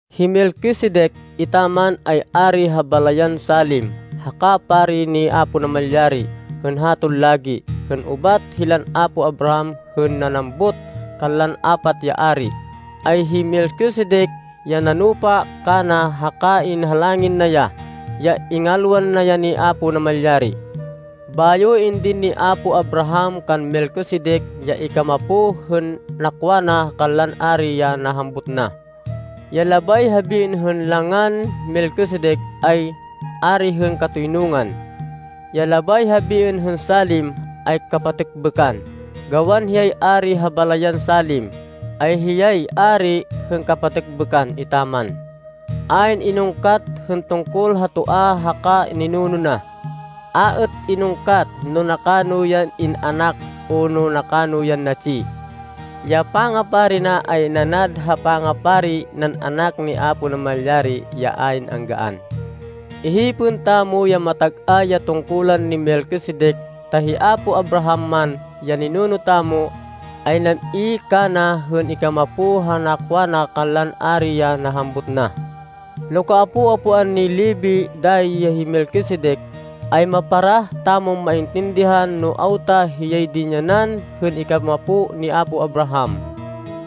Hi Melquisedec etaman, ay ari ha balayan Salem haka pari ni Apo Namalyari. Hên haton lagi, hên ubat hilan apo Abraham hên nanambut kanlan apat ya ari, ay hi Melquisedec ya nanupa kana haka inhalangin na ya, ya ingalwan na ya ni Apo Namalyari. Bayo indin ni apo Abraham kan Melquisedec ya ikamapo hên nakwa na kanlan ari ya nahambut na. (Ya labay habiên hên langan Melquisedec, ay “Ari hên Katoynungan.” Ya labay habiên hên Salem ay “kapatêkbêkan.” Gawan hiyay ari ha balayan Salem, ay hiyay “Ari hên Kapatêkbêkan” etaman.) Ayn inungkat hên tungkol ha toa haka ninuno na. A êt inungkat no nakano yan in-anak o no nakano yan natsi. Ya pangapari na ay nanad ha pangapari nan Anak ni Apo Namalyari ya ayn angaan. Ihipên tamo ya matag-ay ya tungkulan ni Melquisedec, ta hi apo Abraham man, ya ninuno tamo, ay nam-i kana hên ikamapo ha nakwa na kanlan ari ya nahambut na. No kaapo-apoan ni Levi dayi hi Melquisedec, ay maparah tamon maintindihan no awta hiyay dinyanan hên ikamapo ni apo Abraham.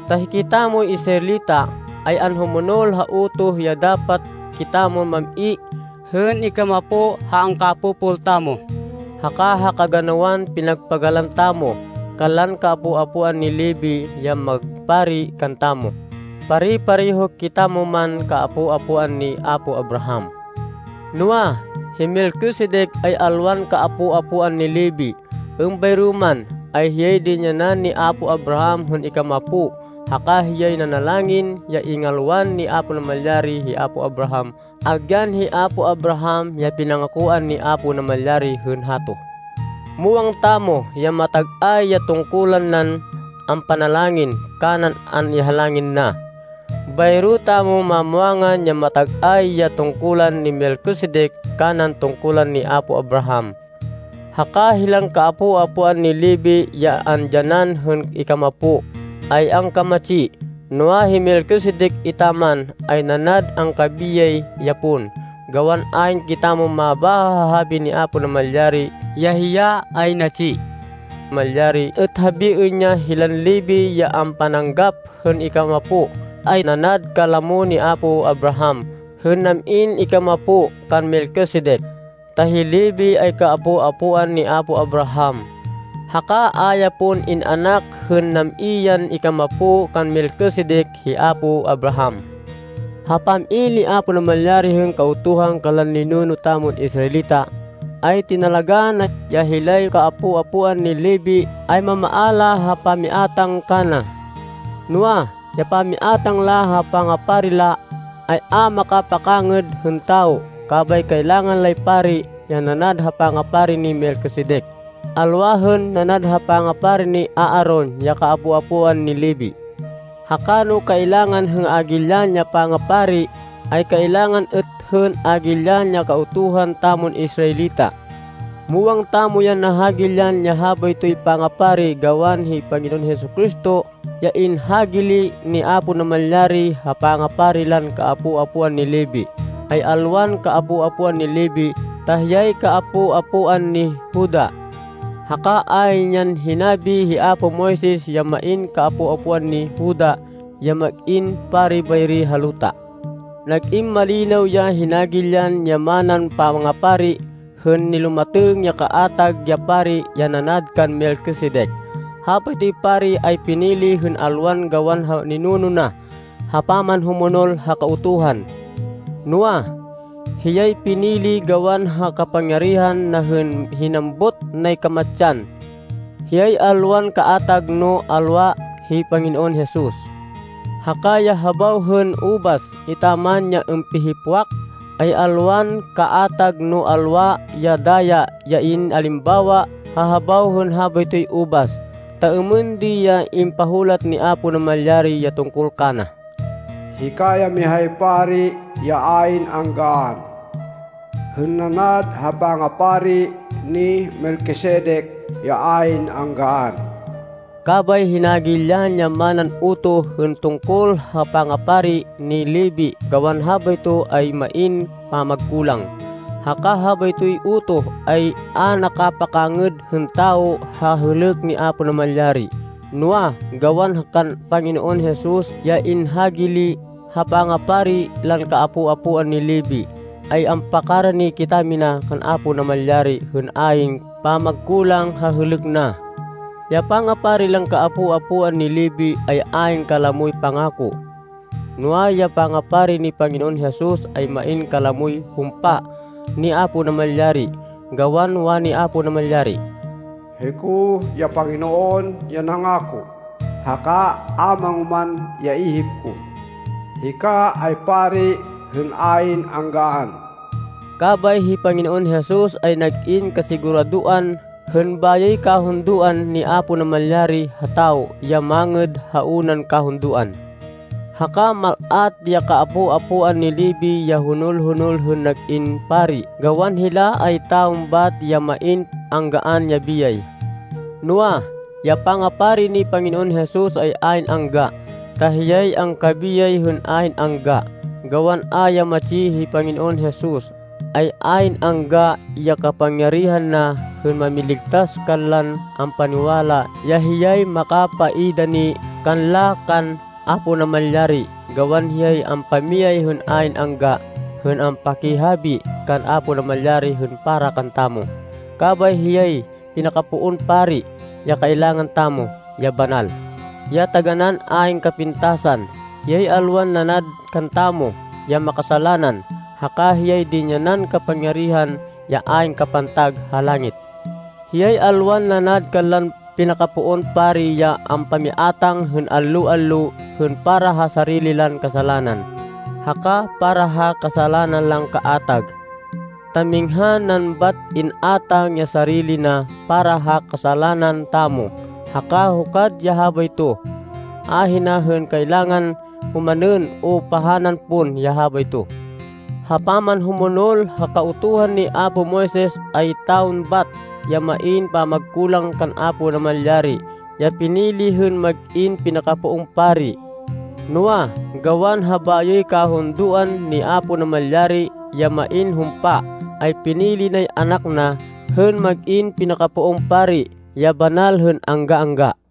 Ta hikitamoy Israelita, ay anhumonol ha utoh ya dapat kitamon mam-i hên ikamapo ha angkapopol tamo, haka ha kaganawan pinagpagalan tamo, kanlan kaapo-apoan ni Levi ya magpari kantamo, pare-pareho kitamo man kaapo-apoan ni apo Abraham. Noa, hi Melquisedec, ay alwan kaapo-apoan ni Levi, êmbayro man, ay hiyay dinyanan ni apo Abraham hên ikamapo. Haka hiyay nanalangin ya ingalwan ni Apo Namalyari hi apo Abraham agyan hi apo Abraham, ya pinangakoan ni Apo Namalyari hên hato. Muwang tamo ya matag-ay ya tungkulan nan ampanalangin kanan an-ihalangin na. Bayro tamo mamwangan ya matag-ay ya tungkulan ni Melquisedec kanan tungkulan ni apo Abraham. Haka hilan kaapo-apoan ni Levi ya andyanan hên ikamapo, ay angkamatsi. Noa, hi Melquisedec etaman, ay nanad angkabiyay ya pon, gawan ayn kitamon mabáha ha habi ni Apo Namalyari ya hiya ay natsi. Malyari êt habiên ya hilan Levi ya ampananggap hên ikamapo, ay nanad kalamo ni apo Abraham hên nam-in ikamapo kan Melchizedec, ta hi Levi ay kaapo-apoan ni apo Abraham, haka a ya pon in-anak hên nam-i yan ikamapo kan Melchizedec hi apo Abraham. Ha pam-i ni Apo Namalyari hên Kautuhan kanlan ninuno tamon Israelita, ay tinalagá na ya hilay kaapo-apoan ni Levi ay mamaala ha pamiátang kana. Noa, ya pamiátang la ha pangapari la, ay a makapakangêd hên tawo. Kabay kailangan lay pari, ya nanad ha pangapari ni Melquisedec, alwa hên nanad ha pangapari ni Aaron ya kaapo-apoan ni Levi. Haka no kailangan hên hagilyan ya pangapari, ay kailangan êt hên hagilyan ya Kautuhan tamon Israelita. Muwang tamo ya nahagilyan ya habaytoy pangapari gawan hi Panginoon Jesu-Cristo ya inhagili ni Apo Namalyari ha pangapari lan kaapo-apoan ni Levi, ay alwan kaapo-apoan ni Levi ta hiyay kaapo-apoan ni Juda. Haka ayn yan hinabi hi apo Moises ya main kaapo-apoan ni Juda ya mag-in pari bayri ha luta. Nag-in malinaw ya hinagilyan ya manan pangapari, hên nilumatêng ya kaatag ya pari ya nanad kan Melquisedec. Habaytoy pari ay pinili hên alwan gawan ha ninuno na, ha pamanhumonol ha Kautuhan. Noa, hiyay pinili gawan ha kapangyarihan na hên hinambut nay kamatsan. Hiyay alwan kaatag no alwa hi Panginoon Jesus. (Haka ya habaw hên ubas etaman ya ampihipwak, ay alwan kaatag no alwa ya daya ya in-alimbawa ha habaw hên habaytoy ubas.) Ta êmên di ya impahulat ni Apo Namalyari ya tungkol kana, “Hika ya mihay pari ya ayn anggaan, hên nanad ha pangapari ni Melquisedec ya ayn anggaan.” Kabay hinagilyan ya manan utoh hên tungkol ha pangapari ni Levi gawan habayto ay main pamagkulang. Haka habaytoy utoh ay a nakapakangêd hên tawo ha hêlêk ni Apo Namalyari. Noa, gawan kan Panginoon Jesus ya inhagili ha pangapari lan kaapo-apoan ni Levi ay ampakarani kitamina kan Apo Namalyari hên ayn pamagkulang ha hêlêk na. Ya pangapari lan kaapo-apoan ni Levi, ay ayn kalamoy pangako. Noa, ya pangapari ni Panginoon Jesus ay main kalamoy humpa ni Apo Namalyari, gawan wani Apo Namalyari, “Hiko ya Panginoon ya nangako, haka a mangoman ya ihip ko, ‘Hika ay pari hên ayn anggaan!’” Kabay hi Panginoon Jesus ay nag-in kasiguradoan hên bayoy kahundoan ni Apo Namalyari ha tawo ya mangêd ha unan kahundoan. Haka mal-at ya kaapo-apoan ni Levi ya honol-honol hên nag-in pari gawan hila ay tawo bat ya main anggaan ya biyay. Noa, ya pangapari ni Panginoon Jesus ay ayn angga, ta hiyay angkabiyay hên ayn angga. Gawan a ya matsi hi Panginoon Jesus, ay ayn angga ya kapangyarihan na hên mamiligtas kanlan ampaniwala ya hiyay makapaidani kanla kan Apo Namalyari. Gawan hiyay ampamiyay hên ayn angga hên ampakihabi kan Apo Namalyari hên para kantamo. Kabay hiyay pinakapoon pari ya kailangan tamo ya banal, ya taganán ayn kapintasan. Hiyay alwan nanad kantamo ya makasalanan, haka hiyay dinyanan kapangyarihan ya ayn kapantag ha langit. Hiyay alwan nanad kanlan pinakapoon pari ya ampamiátang hên allo-allo, hên para ha sarili lan kasalanan, haka para ha kasalanan lan kaatag. Ta minghan nan bat in-átang ya sarili na para ha kasalanan tamo, haka hukad ya habayto. Ahina hên kailangan omanên o pahanan pon ya habayto. Ha pamanhumonol ha Kautuhan ni apo Moises, ay tawon bat, ya main pamagkulang kan Apo Namalyari ya pinili hên mag-in pinakapoon pari. Noa, gawan ha bayoy kahundoan ni Apo Namalyari ya main humpa, ay pinili nay Anak na hên mag-in pinakapoon pari, ya banal hên angga-angga.